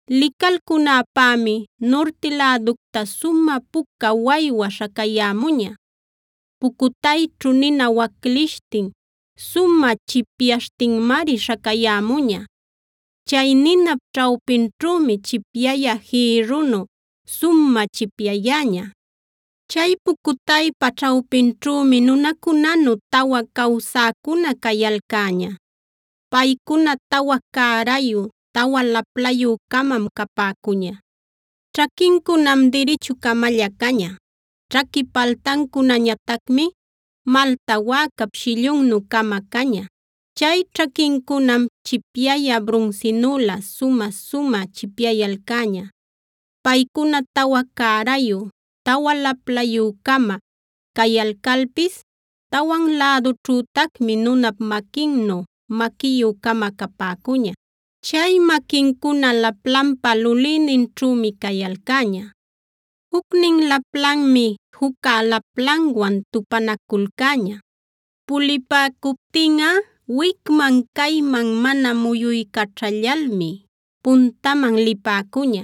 Licalcunäpämi nurti läducta sumä puca waywa śhacayämuña; pucutayćhu nina waclishtin sumä chipyaśhtinmari śhacayämuña. Chay ninap ćhawpinćhümi chipyayä jïrrunu sumä chipyayäña. Chay pucutaypa ćhawpinćhümi nunacunanu tawa cawsäcuna cayalcäña.d Paycuna tawa cärayu, tawa laplayü-camam capäcuña. Ćhaquincunam dirichu-camalla caña; ćhaqui paltancunañatacmi malta wäcap shillunnu-cama caña. Chay ćhaquincunam chipyayä brunsinülä sumä-sumä chipyayalcäña. Paycuna tawa cärayu, tawa laplayü-cama cayalcalpis tawan lädunćhütacmi nunap maquinnu maquiyü-cama capäcuña. Chay maquincuna laplanpa lulïninćhümi cayalcäña. Jucnin laplanmi jucca laplanwan tupanaculcäña. Pulipäcuptinꞌa wicman-cayman mana muyuycaćhallalmi puntaman lipäcuña.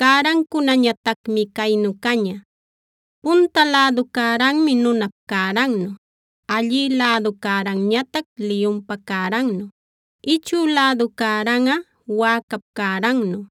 Cärancunañatacmi caynu caña: Punta lädu cäranmi nunap cärannu, allï lädu cäranñatac liyunpa cärannu, ichü lädu cäranꞌa wäcap cärannu,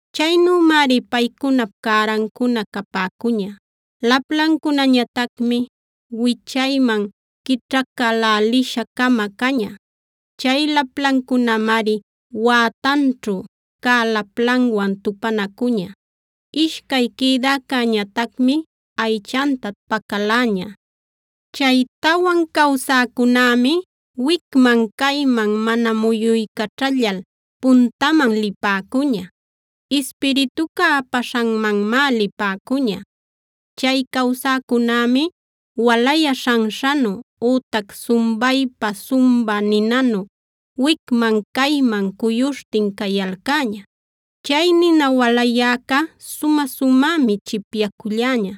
Chaynümari paycunap cärancuna capäcuña. Laplancunañatacmi wichayman quićhacälälisha-cama caña. Chay laplancunamari wätanćhu cä laplanwan tupanacuña. Ishcay quïdäcäñatacmi aychanta pacaläña. Chay tawan cawsäcunämi wicman-cayman mana muyuycaćhallal puntaman lipäcuña. Ispirituca apaśhanmanmá lipäcuña. Chay cawsäcunämi walayä śhanśhanu, ütac sumbaypa sumbä ninanüf wicman-cayman cuyuśhtin cayalcäña. Chay nina walayäca sumä-sumämi chipyaculläña.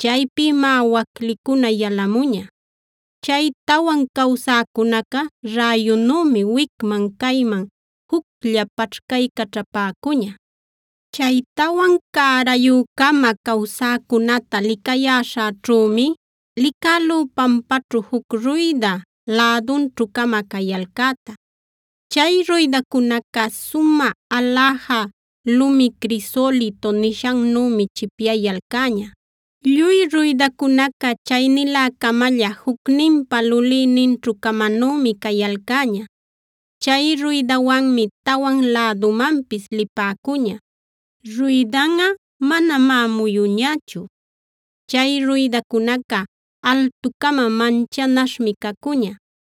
Chaypïmá waclicuna yalamuña. Chay tawan cawsäcunaca räyunümi wicman-cayman juclla paćhcaycaćhapäcuña. Chay tawan cärayü-cama cawsäcunäta licayäśhäćhümi licälú pampaćhu juc ruyda lädunćhu-cama cayalcäta. Chay ruydacunaca sumä aläja lumi crisolito nishannümi chipyayalcäña. Lluy ruydacunaca chaynilä-camalla, jucninpa lulïninćhu-camanümi cayalcäña. Chay ruydawanmi tawan lädumanpis lipäcuña; ruydanꞌa manamá muyuñächu. Chay ruydacunaca altu-cama manchanaśhmi cacuña.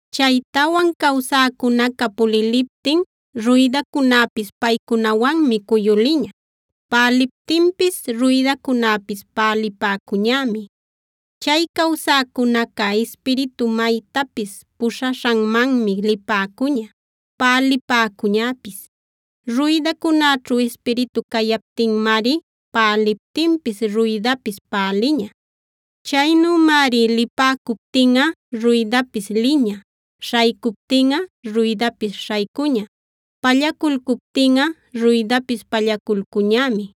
Chay tawan cawsäcunaca puliliptin ruydacunäpis paycunawanmi cuyuliña. Päliptinpis ruydacunäpis pälipäcuñämi. Chay cawsäcunaca Ispiritu maytapis puśhaśhanmanmi lipäcuña, pälipäcuñäpis. Ruydacunäćhu Ispiritu cayaptinmari päliptinpis ruydapis päliña. Chaynümari lipäcuptinꞌa ruydapis liña, śhaycuptinꞌa ruydapis śhaycuña. Pallaculcuptinꞌa ruydapis pallaculcuñämi.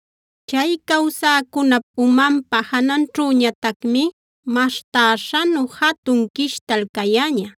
Chay cawsäcunap umanpa jananćhüñatacmi maśhtäśhanu jatun quishtal cayäña.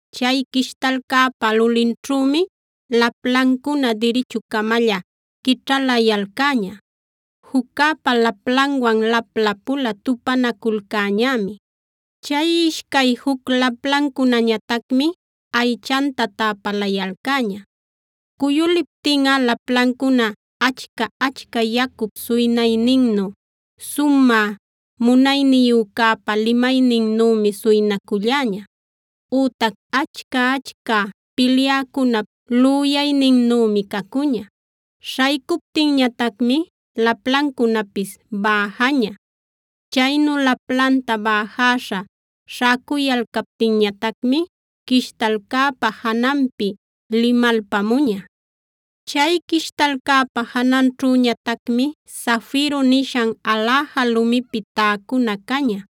Chay quishtalcäpa lulinćhümi laplancuna dirichu-camalla quićhalayalcäña. Juccäpa laplanwan lapla-pula tupanaculcäñämi. Chay ishcay juc laplancunañatacmi aychanta täpalayalcäña. Cuyuliptinꞌa laplancuna achca-achca yacup suynayninnu,j Sumä Munayniyücäpa limayninnümi suynaculläña, ütac achca-achca pilyäcunap lüyayninnümi cacuña. Śhaycuptinñatacmi laplancunapis bäjaña. Chaynu laplanta bäjäśha śhäcuyalcaptinñatacmi quishtalcäpa jananpi limalpamuña. Chay quishtalcäpa jananćhüñatacmi zafiro nishan aläja lumipi täcuna caña.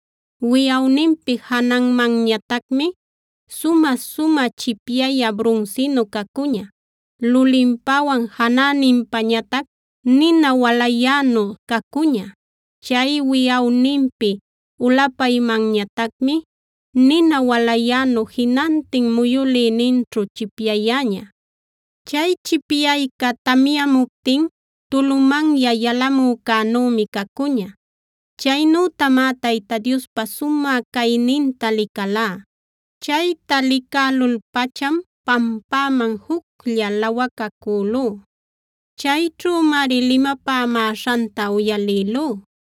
Wiyawninpi jananmanñatacmi sumä-sumä chipyayä brunsinu cacuña; lulinpawan janäninpañatac nina walayänu cacuña.l Chay wiyawninpi ulapaymanñatacmi nina walayänu jinantin muyülïninćhu chipyayäña. Chay chipyayca tamyamuptin tulumanya yalamücänümi cacuña. Chaynütamá Tayta Diospa sumä cayninta licälá. Chayta licälul-pacham pampäman juclla lawacacälú. Chayćhümari limapämäśhanta uyalïlú.